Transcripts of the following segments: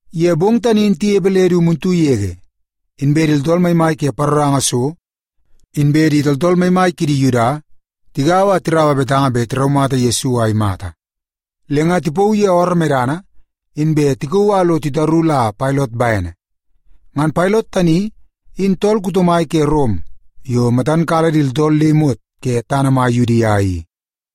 Ye bong tani in tinepe le du muntu yege, inbe di tooltool maimai ke paroranga so inbe di tooltool maimai kidi Yuda tigaua a tiraua betanga bet tiraumata Yesu a imata. Le nga tipauu ye ooroo medana, inbe tikauu a lo titaru la Pailot bene. Ngan Pailot tani in tool kuto mai ke Rom yo matan kala di tooltool le imot ke tana mai Yudia i.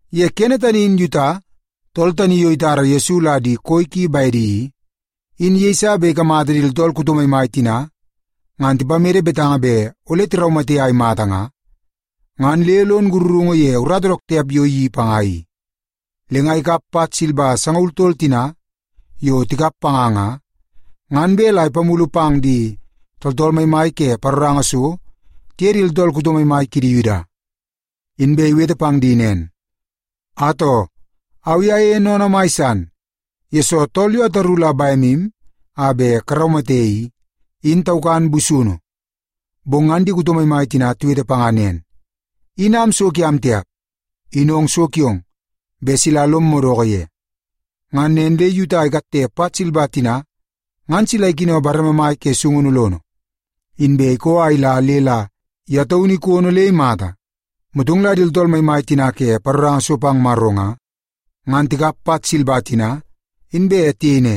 Ye kene tani in Yuta, tool tani yo itara Yesu la di koi ki bedi i, in yeiso bet ikamata di tooltool kuto maimai tina ngan tipamede betanga bet ole tiraumate a imata nga, ngan le lon sakarungu ye urata dook tiap yo iyeii panga i. Le nga ikap pat silba sangaul tol tina yo tikap panga nga, ngan bet la ipamulu pang di tooltool maimai ke paroranga so tiye di tooltool kuto maimai kidi Yuda. Inbe iwete pang di nen, “Atoo, au i ayeie sennene mai san, yesoo tool yo ataru la bemu a bet karaumate i, in taukan busunu.” Bong ngan di kuto maimai tina tiwete panga nen, “In am so kiam tiap. In ong so kiong bet sila lom madoko ye.” Ngan nen le Yuta ikatte pat silba tina ngan sila ikino bareme mai ke sungunu lono, inbe ikoo a ila le la ye taunu ikono le imata. Motong la di tooltool maimai tina ke paroranga so pang Maro nga, ngan tikap pat silba tina, inbe tiyei ne,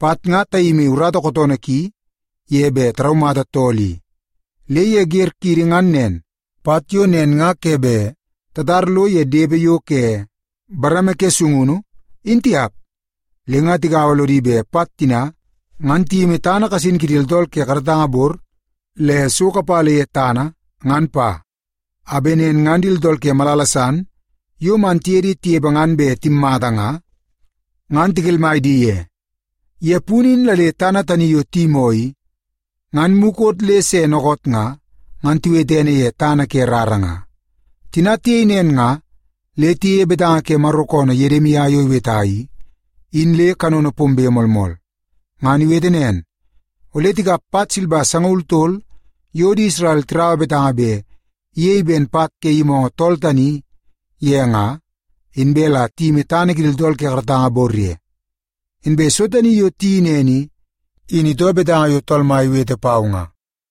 “Pat nga tayimi urata kootoonoo ki ye bet taraumata tool i. Le ye wer kiidi ngan nen, pat yo nen nga ke bet tatar lo ye depe yo ke bareme ke sungunu, in tiap.” Le nga tigaua lodi bet pat tina ngan tiyimi tana kasin kidi tooltool ke karatanga bor le so kapala ye tana, ngan pa. A bet nen ngan di tooltool ke malala san yo man tiye di tinepe ngan bet timmata nga, ngan tikelmai di ye. Ye punu in la le tana tani yo tiyimoo i, ngan mukot le se dookoot nga, ngan tiwete ene ye Tana Ke Rara nga. Tina tiyei nen nga, le tiyeie betanga ke Maro koonoo Yedimia yo iweta i, in le kanono pombe moolmool. Ngan iwete nen, “Ole tikap pat silba sangaul tol yo di Isrel tiraua betanga bet iyei ben pat ke yimoongoo tool tani ye nga, inbe la tiyimi tana kidi tooltool ke karatanga bor ye. Inbe so tani yo tiyeii nen i, in itoo betanga yo Tool Mai iwete pau nga.”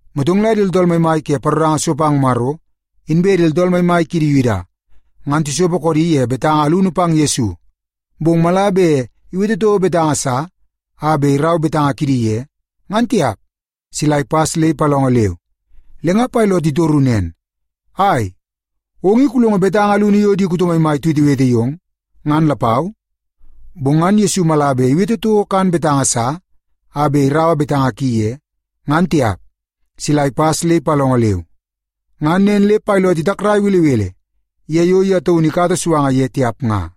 Motong la di tooltool maimai ke paroranga so pang Maro, inbe di tooltool maimai kidi Yuda, ngan tisopo koodi ye betanga alunu pang Yesu, bong mala bet iwete toko betanga sa a bet irau betanga kidi ye, ngan tiap, sila ipas le ipalongo leu. Le nga Pailot itoru nen, “Ai, ong i kulongo betanga alunu yo di kuto maimai tiwetewete yong, ngan lapau?” Bong ngan Yesu mala bet iwete toko kan betanga sa a bet iraua betanga ki ye, ngan tiap, sila ipas le ipalongo leu. Ngan nen le Pailot itakrai belebele ye yo ye taunu ikata suanga ye tiap nga.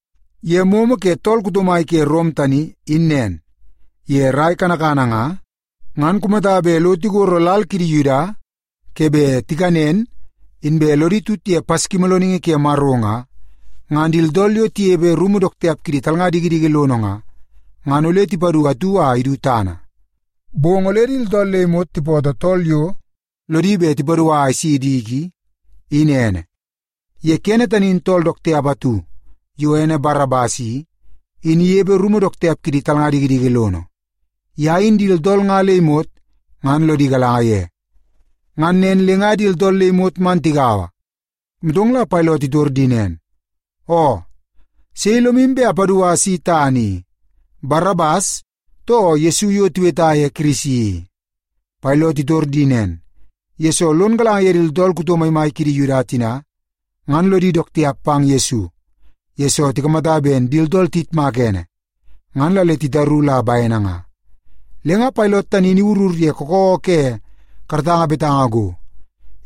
Ye momo ke tool kuto mai ke Rom tani, in nen. Ye rai kanakana nga, ngan kumata bet lo tigoro lal kidi Yuda ke bet tikanen inbe lodi tut ye Paskimoolooningi Ke Maro nga, ngan di tooltool yo tinepe rumu dook tiap kidi talnga dikidiki lono nga, ngan ole ipadu atu a idu tana. Bong ole di tooltool le imot tipootoo tool yo lodi bet ipadua a isi diki in ene. Ye kene tani in tool dook tiap atu yo ene Barabas i, in inepe rumu dook tiap kidi talnga dikidiki lono. Ye in di tooltool nga le imot ngan lodi galanga ye. Ngan nen le nga di tooltool le imot man tigaua, motong la Pailot itor di nen, “Oo, sei lomu bet apadua isi tana i; Barabas, too Yesu yo tiweta ye Kirisi i?” Pailot itor di nen, yesoo lon galanga ye di tooltool kuto maimai kidi Yuda tina ngan lodi dook tiap pang Yesu, yesoo tikamata ben di tooltool tiyitmaka ene, ngan la le titaru la bene nga. Le nga Pailot tani in iwurur ye kakawa ke karatanga betanga go,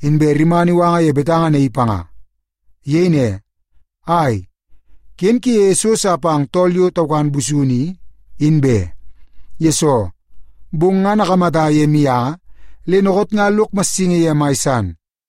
inbe rimana iwanga ye betanga naii panga. Iyei ne, “Ai, ken kuyeie so sa pang tool yo taukan busunu i, in be. Yesoo, bong ngan akamata ye mianga le dookoot nga lok massingi ye mai san.”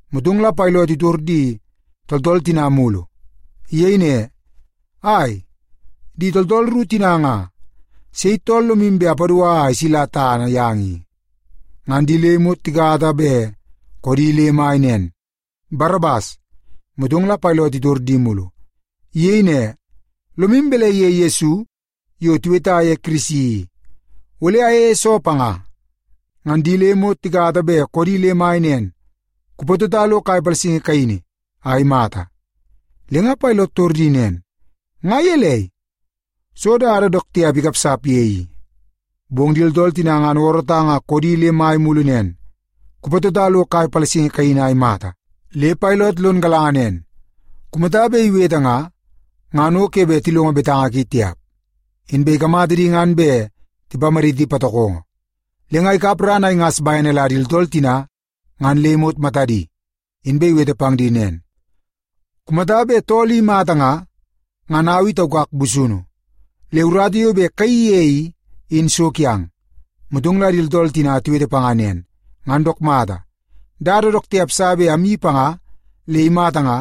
Motong la Pailot itor di tooltool tina mulu. Iyei ne, “Ai, di tooltool ru tina nga, sei tool lomu bet apadua a isila tana yang i?” Ngan di le imot tikata bet koodi le mai nen, “Barabas!” Motong la Pailot itor di mulu. Iyei ne, “Lomu balai ye Yesu yo tiweta ye Kirisi i? Ole ayeie soo panga?” Ngan di le imot tikata bet koodi le mai nen, “Kupatota lo kai palasingi kaini a imata!” Le nga Pailot itor di nen, “Nga gelei? Soo dada dook tiap ikapsap ye i?” Bong di tooltool tina ngan oorootang a koodi le mai mulu nen, “Kupatota lo kai palasingi kaini a imata!” Le Pailot lon galanga nen, kumata bet iwete nga, ngan o ke bet tilongo betanga ki tiap. Inbe ikamata di ngan bet tipamaditi patokongo. Le nga ikap ran a ingas bene la di tooltool tina ngan le imot matadi, inbe iwete pang di nen, “Kumata bet tool i imata nga, ngan au i taukak busunu. Le urata yo bet kayeii ye i, in so kiang.” Motong la di tooltool tina tiwete panga nen, “Ngan dook mata, dada dook tiap sa bet amyeii panga le imata nga,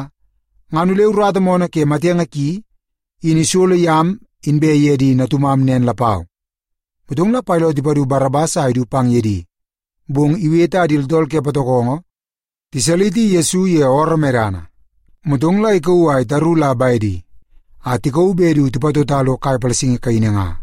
ngan ole urata moonoo ke matenge ki in isolo yam inbe ye di natumam nen lapau.” Motong la Pailot ipadu Barabas a idu pang ye di. Bong iwete a di tooltool ke patokongo tisaliti Yesu ye ooroo medana, motong la ikauu a itaru la bedi a tikauu bet du tipatota lo kai palasingi kaini nga.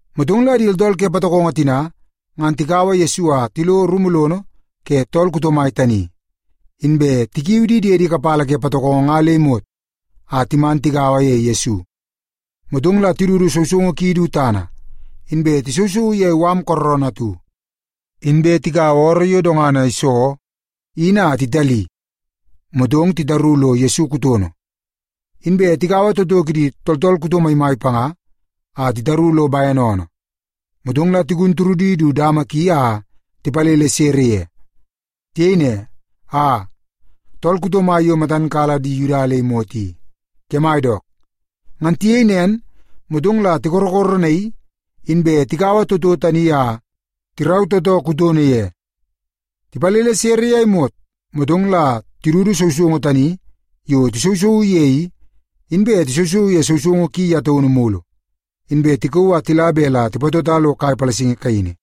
Motong la di tooltool ke patokongo tina ngan tikaua Yesu a tilo rumu lono ke tool kuto mai tani, inbe tikiu di diedi kapala ke patokongo nga le imot a timan tigaua ye Yesu. Motong la tidudu sousoungu ki du tana, inbe tisousouu ye mala kooroonoo atu. Inbe tikaua ooroo yo dongana iso in a titali, motong la titaru lo Yesu kutono. Inbe tikaua toto kidi tooltool kuto maimai panga a titaru lo bene oonoo, motong la tigun turudi du dama ki a tipalele sere ye. Tiyei ne, “Aa, tool kuto mai yo matam kala di Yuda le imot i, kemai dook!” Ngan tiyei nen, motong la tikorokoronaii, inbe tikaua toto tani a tirau tootoo kutono ye. Tipalele sere ye a imot, motong la tidudu sousoungu tani yo tisousouu ye i, inbe tisousouu ye sousoungu ki ye taunu mulu, inbe tikauu a tila bet la tipatota lo kai palasingi kaini.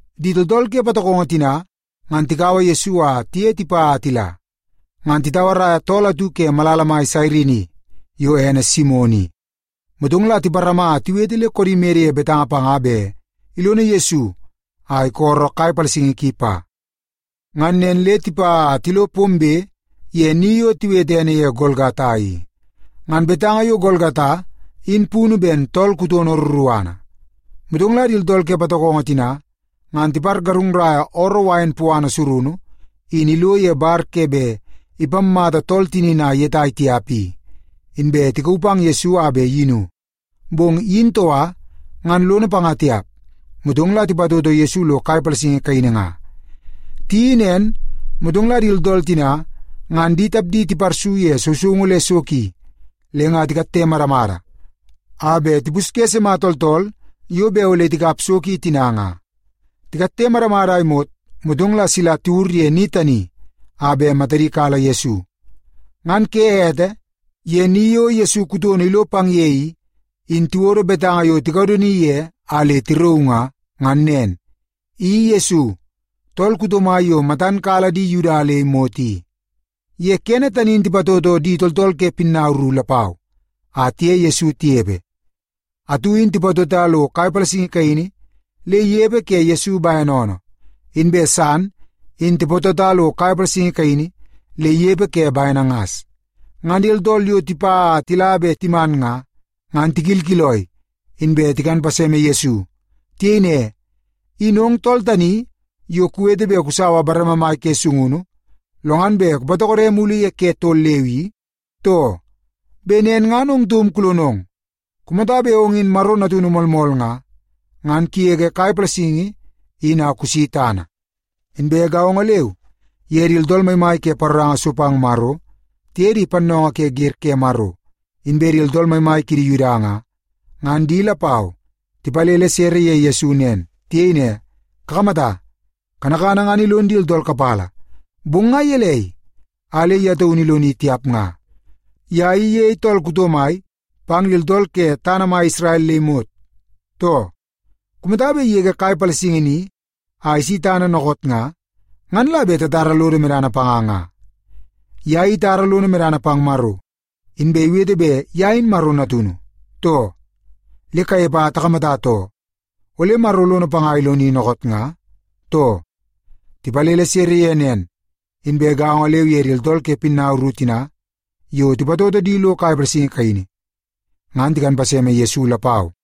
Di tooltool ke patokongo tina ngan tikaua Yesu a tiye tipa a tila, ngan titauaraia tool atu ke malala mai Sairini yo ene Simon i. Motong la tiparama a tiwete le koodi mede ye betanga panga bet ilono Yesu a isolo kai palasingi ki pa. Ngan nen le tipa a tilo pombe ye ni yo tiwete ene ye Golgata i. (Ngan betanga yo Golgata in punu ben Tool Kutono Ruruana). Motong la di tooltool ke patokongo tina ngan tipargarungnaia ooroo wain puana surunu in ilo ye bar ke bet ipammata tool tinini a iyetai tiap i, inbe tikauu pang Yesu a bet iyinu. Bong iyin toka, ngan lono panga tiap. Motong la tipatoto Yesu lo kai palasingi kaini nga. Tiyeii nen, motong la di tina ngan di tapdi tiparsu ye sousoungu le so ki, le nga titoo moomoo kidi a tikatte madamada a bet tipusye sima tooltool yo bet ole tikap so ki tina nga. Tikatte madamada a imot, motong la sila tiwur ye ni tani a bet matadi kala Yesu. Ngan ke ete, ye ni yo Yesu kutono ilo pang ye i, in tiwodo betanga yo tikadoni ye a le tirauu nga, ngan nen: I Yesu, Tool Kuto Mai Yo Matan Kala Di Yuda Le Imot I. Ye kene tani in tipatoto di tooltool ke pinnau ru lapau a tiye Yesu tinepe. Atu in tipatota lo kai palasingi kaini le inepe ke Yesu bene oonoo, inbe san in tipatota lo kai palasingi kaini le inepe ke bene ngas. Ngan di tooltool yo tipa a tila be timan nga, ngan tikilkiloi, inbe tikan paseme Yesu. Tiyei ne, “In ong tool tani yo kuwete bet kusaua bareme mai ke sungunu, lo ngan bet kupatokode mulu ye ke tol leu i, too? Bet nen ngan ong taum kulonong! Kumata bet ong in Maro Natunu moolmool nga, ngan kugege kai palasingi in a kusi tana!” Inbe gaongo leu ye di tooltool maimai ke paroranga so pang Maro tiye di pannoongoo ke wer ke Maro inbe di tooltool maimai kidi Yuda nga, ngan di lapau tipalele sere ye Yesu nen. Tiyei ne, “Kakamata, kanakana ngan ilon di tooltool kapala, bong nga gelei a le ye taunu iloni tiap nga? Ye i iyei tool kuto mai pang di tooltool ke tana mai Isrel le imot, too? Kumata bet igege kai palasingi ni a isi tana dookoot nga, ngan la bet tatara lodo medana panga nga. Ye i itara lono medana pang Maro, inbe iwete bet ye in Maro Natunu, too? Le kanepe a takamata too, ole Maro lono panga a iloni dookoot nga, too?” Tipalele sere ye nen, inbe gaongo leu ye di tooltool ke pinnau ru tina yo tipatoto di lo kai palasingi kaini, ngan tikan paseme Yesu lapau.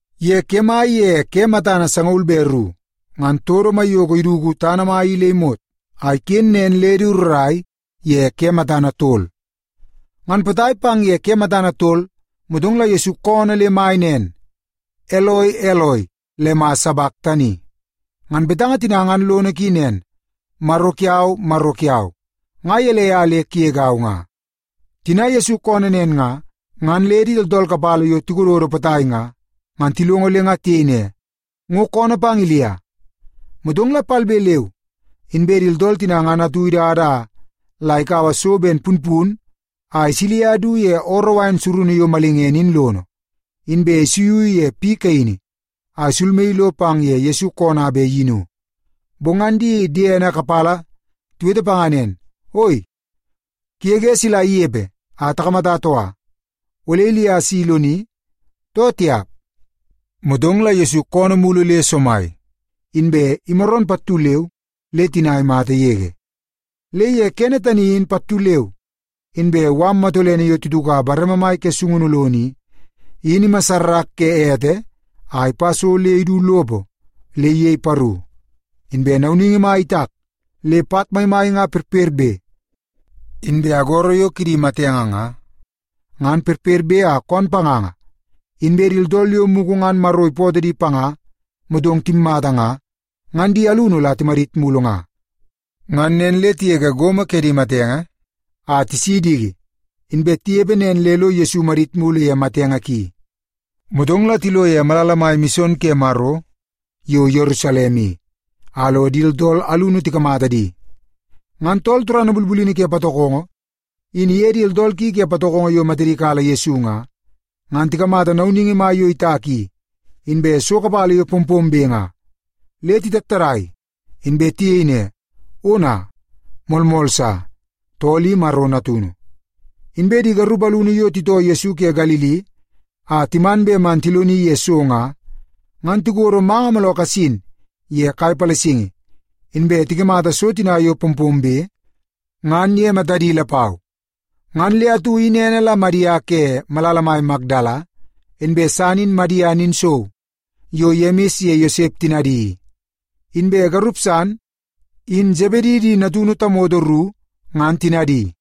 Ye kemai ye ke matana sangaul be ru, ngan todo maiyoko iduku tana mai i le imot, a iken nen le du rrai ye ke matana tol. Ngan potai pang ye ke matana tol, motong la Yesu koonoo le mai nen, “Eloi, Eloi, lema sabaktani?” Ngan betanga tina ngan lono ki nen, “Maro kiau, Maro kiau, nga gelei a le kugegau nga?” Tina Yesu koonoo nen nga, ngan le di tooltool kapala yo tikododo potai nga, ngan tilongo le nga tiyei ne, “Ngo koonoo pang Ilia.” Motong la palbe leu inbe di tooltool tina ngan atu idada la kaua so ben punpun a isilia du ye ooroo wain surunu yo malingene in lono, inbe isuiu ye piu kaini a isulmaii lo pang ye Yesu koonoo a bet iyinu. Bong ngan di diene kapala tiwete panga nen, “Oi, kugege sila inepe a takamata toka. Ole Ilia si iloni, too tiap?” Motong la Yesu koonoo mulu le somai, inbe imaroon pattu leu le tina imata yege. Le ye kene tani in pattu leu inbe mala matolene yo tituka bareme mai ke sungunu lono i, in imassarak ke ete a ipa so le idu lopo le iyei paru. Inbe nauningi mai itak le pat maimai nga perperbe. Inbe agoro yo kidi matenge nga, ngan perperbe a koon panganga, inbe di tooltool yo mugu ngan Maro ipootoo di panga motong timmata nga, ngan di alunu la timadit mulu nga. Ngan nen le tigege gomo kidi matenge a tisi diki, inbe tinepe nen le lo Yesu imadit mulu ye matenge ki. Motong la tilo ye malala mai mison ke Maro yo Yerusalem i, a lo di tooltool alunu tikamata di. Ngan tool turana bulbulini ke patokongo, in iye di tooltool ki ke patokongo yo matadi kala Yesu nga, ngan tikamata nauningi mai yo itak i, inbe so kapala yo pompombe nga, le titattadai, inbe tiyei ne, “Ona, moolmool sa, tool i Maro Natunu!” Inbe di garup alunu yo titoo Yesu ke Galili a timan bet man tiloni ye so nga, ngan tikodo manga mooloo kasin ye kai palasingi, inbe tikamata so tina yo pompombe ngan ye matadi lapau. Ngan le atu in ene la Madia ke malala mai Makdala, inbe san in Madia ninsou yo Yemis ye Yosep tinadi i, inbe garup san in Sebedi di natunu tamoto ru ngan tinadi.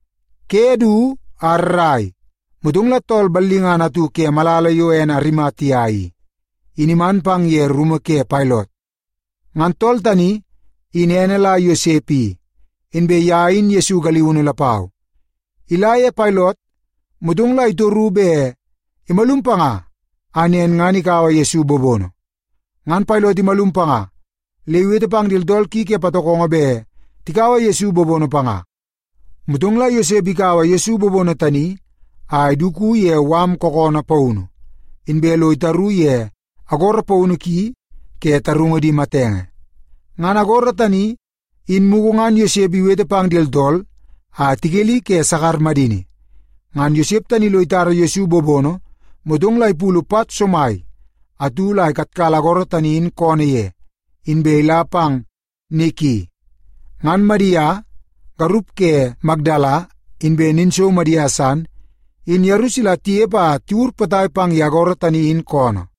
Ke du a rrai, motong la tool ballingana atu ke malala yo ene Arimatia i, in iman pang ye rumu ke Pailot. Ngan tool tani in ene la Yosep i, inbe ye in Yesu galiunu lapau. Ila ye Pailot, motong la itoru bet imalum panga a nen ngan ikaua Yesu bobono. Ngan Pailot imalum panga le iwete pang di tooltool ki ke patokongo bet tikaua Yesu bobono panga. Motong la Yosep ikaua Yesu bobono tani a iduku ye mala kookoonoo paunu, inbe lo itaru ye agoro paunu ki ke tarungu di matenge. Ngan agoro tani, in mugu ngan Yosep iwete pang di tooltool a tikeli ke sakar madini. Ngan Yosep tani lo itara Yesu bobono, motong la ipulu pat somai atu la ikatkala agoro tani in koonoo ye, inbe ila pang ni ki. Ngan Madia, garup ke Makdala, inbe ninsou Madia san, in yeru sila tinepe a tiwur potai pang ye agoro tani in koonoo.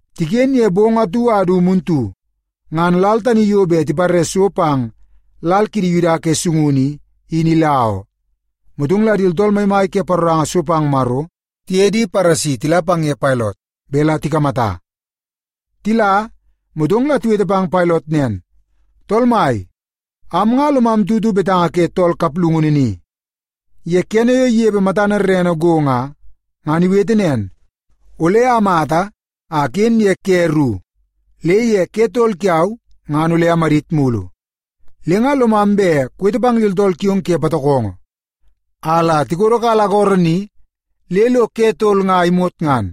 Tiken ye bong atu a du muntu, ngan lal tani yo bet tipare so pang lal kidi Yuda ke sungunu i, in ila oo. Motong la di tooltool maimai ke paroranga so pang Maro tiye di Paresi tila pang ye Pailot bet la tikamata. Tila, motong la tiwete pang Pailot nen, “Tool mai, am nga lomam tutu betanga ke tool kaplungunu ni. Ye kene yo inepe matana rerene go nga, ngan iwete nen, ‘Ole amata a aken ye ke ru, le ye ke tol kiau ngan ole amadit mulu.’ Le nga lomam bet kuwete pang di tooltool kiong ke patokongo a la tikodokala agoro ni le lo ke tol nga imot ngan.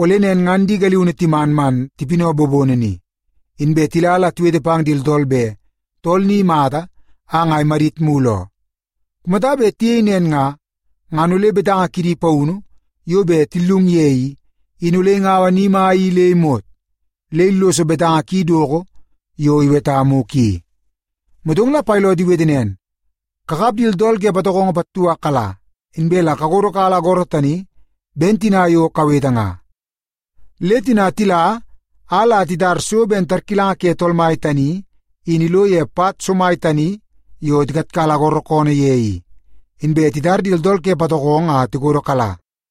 Ole nen ngan di galiunu timan man tipinaua bobono ni, inbe tila la tiwete pang di tooltool bet tool ni imata a nga imadit mulu oo. Kumata bet tiyei nen nga, ngan ole betanga kidi paunu yo bet tillung ye i, in ole ingaua ni mai i le imot, le illoso betanga ki doko yo iweta mugu i.” Motong la Pailot iwete nen, “Kakap di tooltool ke patokongo pattu a kala, inbe la kakodokala agoro tani ben tina yo kawete nga.” Le tina tila a la titara so ben tarkilanga ke tool mai tani in ilo ye pat somai tani yo tikatkala agoro koonoo ye i. Inbe titar di tooltool ke patokongo a tikodokala.